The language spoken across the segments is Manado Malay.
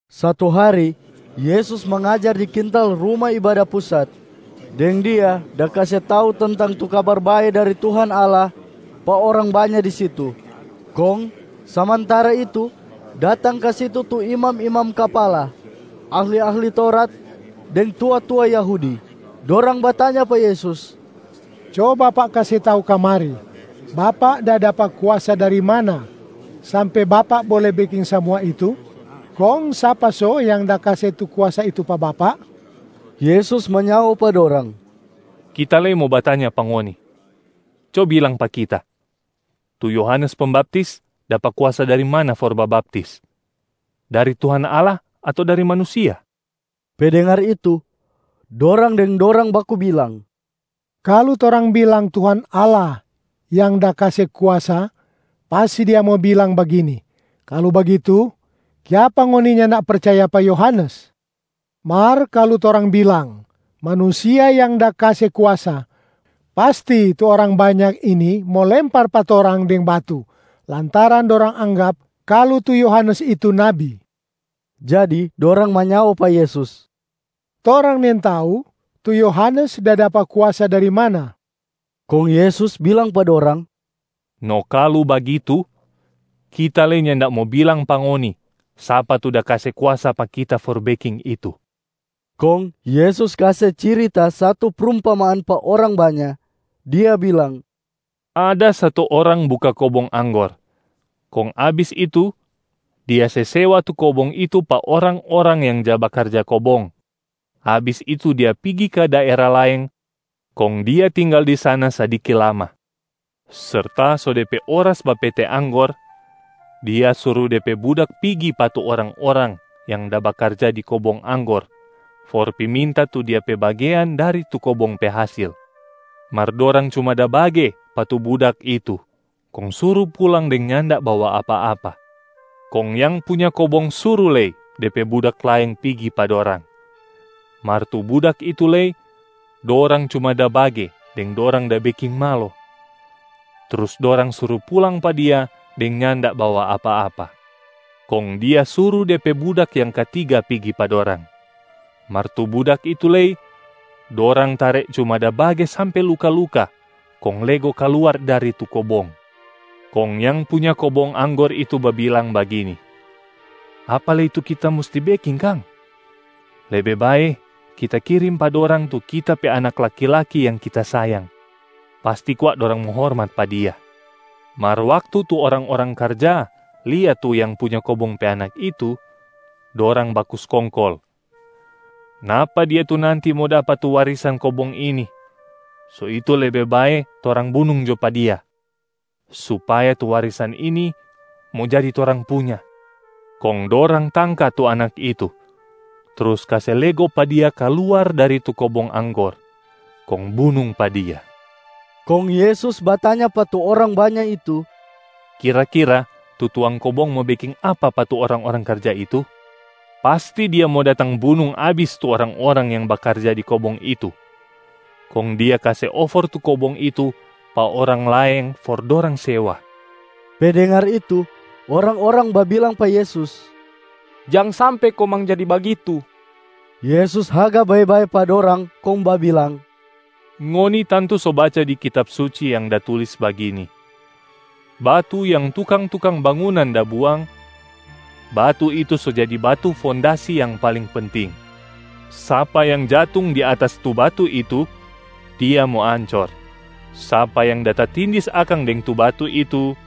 Satu hari, Yesus mangajar di kintal Ruma Ibada Pusat deng Dia da kase tau tentang tu Kabar Bae dari Tuhan Allah pa orang banya di situ. Kong samantara itu datang ka situ tu imam-imam kapala, ahli-ahli Taurat deng tua-tua Yahudi. Dorang batanya pa Yesus, “Co Bapak kase tau kamari, Bapak da dapa kuasa dari mana sampe Bapak bole beking samua itu? Kong sapa so yang da kase tu kuasa itu pa Bapak?” Yesus manyao pa dorang, “Kita lei mo batanya pa ngoni, co bilang pa Kita, tu Yohanes Pembaptis dapa kuasa dari mana for babaptis? Dari Tuhan Allah ato dari manusia?” Pe dengar itu, dorang deng dorang baku bilang, “Kalu torang bilang Tuhan Allah yang da kase kuasa, pasti Dia mo bilang bagini, ‘Kalu bagitu, kiapa ngoni nyanda percaya pa Yohanes?’ Mar kalu torang bilang, ‘Manusia yang da kase kuasa,’ pasti tu orang banya ini mo lempar pa torang deng batu lantaran dorang anggap kalu tu Yohanes itu nabi.” Jadi dorang manyao pa Yesus, “Torang nintau tu Yohanes da dapa kuasa dari mana.” Kong Yesus bilang pa dorang, “No kalu bagitu, Kita lei nyanda mo bilang pa ngoni sapa tu da kase kuasa pa kita for beking itu.” Kong Yesus kase cirita satu prumpamaan pa orang banya, Dia bilang, “Ada satu orang buka kobong anggor, kong abis itu dia se sewa tu kobong itu pa orang-orang yang ja bakarja kobong. Abis itu dia pigi ka daera laeng kong dia tinggal di sana sadiki lama. Serta so de pe oras bapete anggor, dia suru de pe budak pigi pa tu orang-orang yang da bakarja di kobong anggor for pi minta tu dia pe bagean dari tu kobong pe hasil. Mar dorang cuma da bage pa tu budak itu kong suru pulang deng nyanda bawa apa-apa. Kong yang punya kobong suru lei de pe budak laeng pigi pa dorang. Mar tu budak itu lei dorang cuma da bage deng dorang da beking malo, trus dorang suru pulang pa dia deng nyanda bawa apa-apa. Kong dia suru de pe budak yang katiga pigi pa dorang. Mar tu budak itu lei dorang tare cuma da bage sampe luka-luka kong lego kaluar dari tu kobong. Kong yang punya kobong anggor itu babilang bagini, ‘Apa lei tu kita musti beking kang? Lebe bae kita kirim pa dorang tu kita pe anak laki-laki yang kita sayang, pasti kwa dorang mo hormat pa dia.’ Mar waktu tu orang-orang karja lia tu yang punya kobong pe anak itu, dorang baku skongkol, ‘Napa dia tu nanti mo dapa tu warisan kobong ini. So itu lebe bae torang bunung jo pa dia, supaya tu warisan ini mo jadi torang punya.’ Kong dorang tangka tu anak itu trus kase lego pa dia kaluar dari tu kobong anggor kong bunung pa dia.” Kong Yesus batanya pa tu orang banya itu, “Kira-kira tu tuang kobong mo beking apa pa tu orang-orang karja itu? Pasti dia mo datang bunung abis tu orang-orang yang bakarja di kobong itu, kong dia kase ofor tu kobong itu pa orang laeng for dorang sewa.” Pe dengar itu, orang-orang babilang pa Yesus, “Jang sampe komang jadi bagitu!” Yesus haga bae-bae pa dorang kong babilang, “Ngoni tantu so baca di Kitab Suci yang da tulis bagini, ‘Batu yang tukang-tukang bangunan da buang, batu itu so jadi batu fondasi yang paling penting.’ Sapa yang jatung di atas tu batu itu, dia mo ancor. Sapa yang da tatindis akang deng tu batu itu,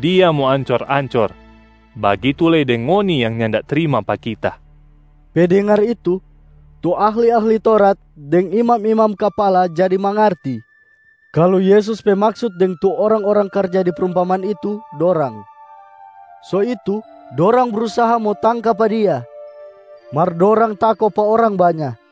dia mo ancor-ancor, bagitu lei deng ngoni yang nyanda trima pa Kita.” Pe dengar itu, tu ahli-ahli Taurat deng imam-imam kapala jadi mangarti kalu Yesus pe maksut deng tu orang-orang karja di prumpamaan itu dorang. So itu dorang brusaha mo tangka pa Dia, mar dorang tako pa orang banya.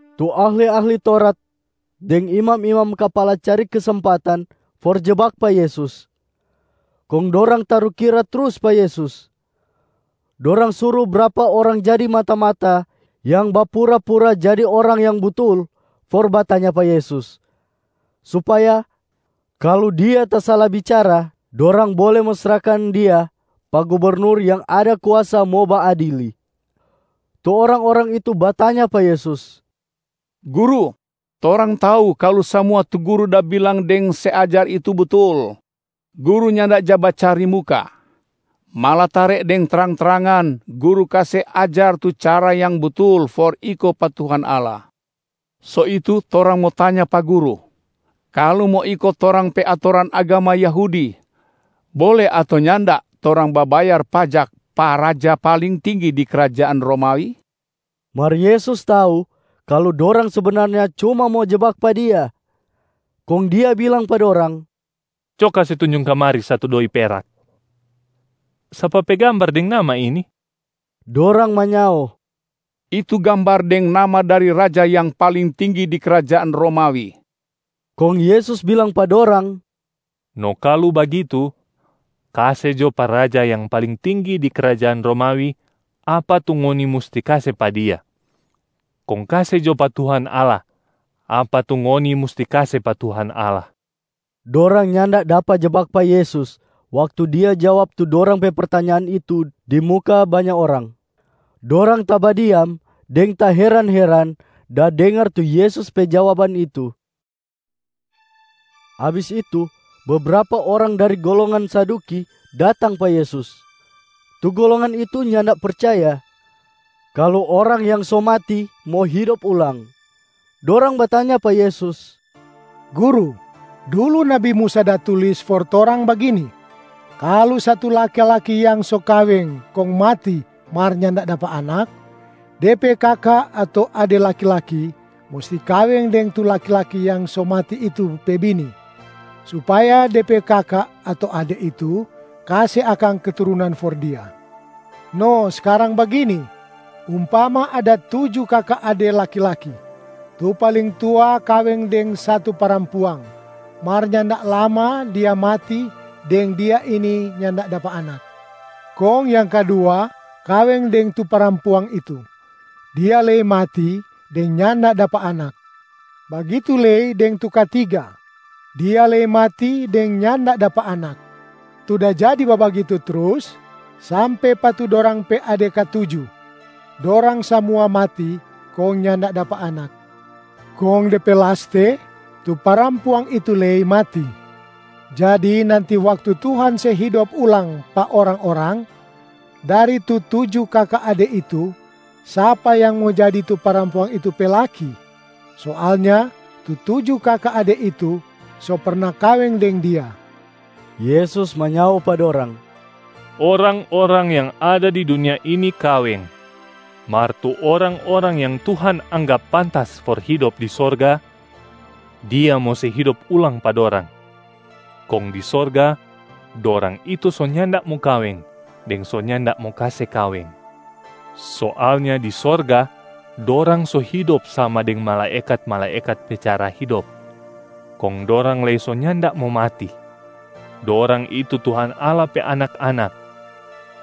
Tu ahli-ahli Taurat deng imam-imam kapala cari kesempatan for jebak pa Yesus. Kong dorang tarukira trus pa Yesus. Dorang suru brapa orang jadi mata-mata yang bapura-pura jadi orang yang butul for batanya pa Yesus, supaya kalu Dia tasala bicara dorang bole mo srahkan Dia pa gubernur yang ada kuasa mo baadili. Tu orang-orang itu batanya pa Yesus, “Guru, torang tau kalu samua tu Guru da bilang deng se ajar itu butul. Guru nyanda ja bacari muka, malatare deng trang-trangan Guru kase ajar tu cara yang butul for iko pa Tuhan Allah. So itu torang mo tanya pa Guru, kalu mo iko torang pe atoran agama Yahudi, bole ato nyanda torang babayar pajak pa raja paling tinggi di krajaan Romawi?” Mar Yesus tau kalu dorang sebenarnya cuma mo jebak pa Dia, kong Dia bilang pa dorang, “Co kase tunjung kamari satu doi perak. Sapa pe gambar deng nama ini?” Dorang manyao, “Itu gambar deng nama dari raja yang paling tinggi di krajaan Romawi.” Kong Yesus bilang pa dorang, “No kalu bagitu, kase jo pa raja yang paling tinggi di krajaan Romawi apa tu ngoni musti kase pa dia, kong kase jo pa Tuhan Allah apa tu ngoni musti kase pa Tuhan Allah.” Dorang nyanda dapa jebak pa Yesus waktu Dia jawab tu dorang pe pertanyaan itu di muka banya orang. Dorang tabadiam deng taheran-heran da dengar tu Yesus pe jawaban itu. Abis itu bebrapa orang dari golongan Saduki datang pa Yesus. Tu golongan itu nyanda percaya kalu orang yang so mati mo hidop ulang. Dorang batanya pa Yesus, “Guru, dulu nabi Musa da tulis for torang bagini: kalu satu laki-laki yang so kaweng kong mati mar nyanda dapa anak, de pe kaka ato ade laki-laki musti kaweng deng tu laki-laki yang so mati itu pe bini, supaya de pe kaka ato ade itu kase akang keturunan for dia. No skarang bagini, umpama ada tuju kaka ade laki-laki. Tu paling tua kaweng deng satu parampuang, mar nyanda lama dia mati deng dia ini nyanda dapa anak. Kong yang kadua kaweng deng tu parampuang itu. Dia lei mati deng nyanda dapa anak. Bagitu lei deng tu katiga, dia lei mati deng nyanda dapa anak. Tu da jadi babagitu trus sampe pa tu dorang pe ade katuju. Dorang samua mati kong nyanda dapa anak. Kong de pe laste tu parampuang itu lei mati. Jadi nanti waktu Tuhan se hidop ulang pa orang-orang, dari tu tuju kaka ade itu sapa yang mo jadi tu parampuang itu pe laki? Soalnya tu tuju kaka ade itu so perna kaweng deng dia.” Yesus manyao pa dorang, “Orang-orang yang ada di dunia ini kaweng. Mar tu orang-orang yang Tuhan anggap pantas for hidop di sorga, Dia mo se hidop ulang pa dorang, kong di sorga dorang itu so nyanda mo kaweng deng so nyanda mo kase kaweng. Soalnya di sorga dorang so hidop sama deng malaekat-malaekat pe cara hidop, kong dorang lei so nyanda mo mati. Dorang itu Tuhan Allah pe anak-anak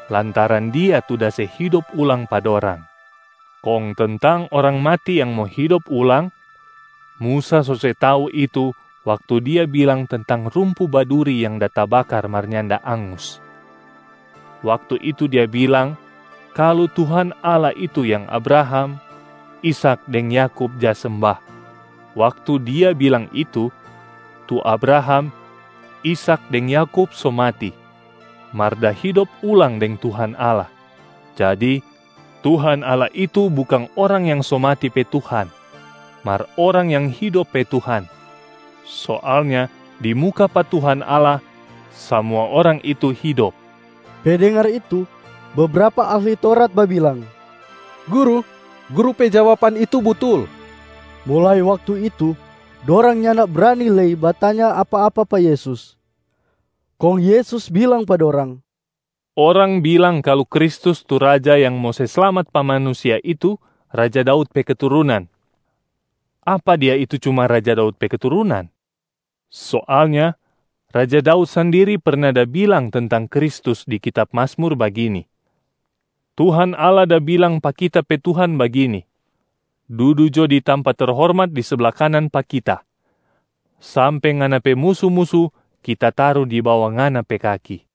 lantaran Dia tu da se hidop ulang pa dorang. Kong tentang orang mati yang mo hidop ulang, Musa so se tau itu waktu dia bilang tentang rumpu baduri yang da tabakar mar nyanda angus. Waktu itu dia bilang kalu Tuhan Allah itu yang Abraham, Ishak deng Yakub ja semba. Waktu dia bilang itu, tu Abraham, Ishak deng Yakub so mati mar da hidop ulang deng Tuhan Allah. Jadi Tuhan Allah itu bukang orang yang so mati pe Tuhan, mar orang yang hidop pe Tuhan. Soalnya di muka pa Tuhan Allah, samua orang itu hidop.” Pe dengar itu bebrapa ahli Taurat babilang, “Guru, Guru pe jawaban itu butul.” Mulai waktu itu dorang nyanda brani lei batanya apa-apa pa Yesus. Kong Yesus bilang pa dorang, “Orang bilang kalu Kristus tu Raja yang mo se slamat pa manusia itu raja Daud pe keturunan, apa Dia itu cuma raja Daud pe keturunan? Soalnya raja Daud sandiri perna da bilang tentang Kristus di kitab Mazmur bagini, ‘Tuhan Allah da bilang pa kita pe Tuhan bagini: Dudu jo di tampa terhormat di sabla kanan pa Kita, sampe Ngana pe musu-musu Kita taru di bawa Ngana pe kaki.’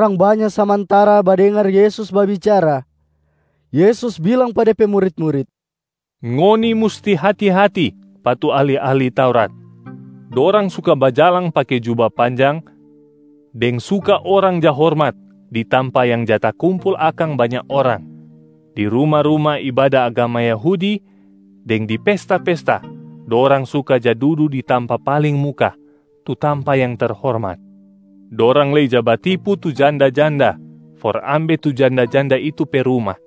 Waktu orang banya samantara badengar Yesus babicara, Yesus bilang pa De pe murit-murit, “Ngoni musti hati-hati pa tu ahli-ahli Taurat! Dorang suka bajalang pake juba panjang deng suka orang ja hormat di tampa yang ja takumpul akang banya orang. Di ruma-ruma ibada agama Yahudi deng di pesta-pesta dorang suka ja dudu di tampa paling muka tu tampa yang terhormat. Dorang lei ja batipu tu janda-janda for ambe tu janda-janda itu pe ruma.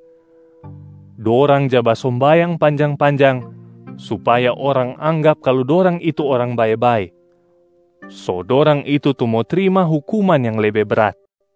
Dorang ja basombayang panjang-panjang supaya orang anggap kalu dorang itu orang bae-bae. So dorang itu tu mo trima hukuman yang lebe brat.”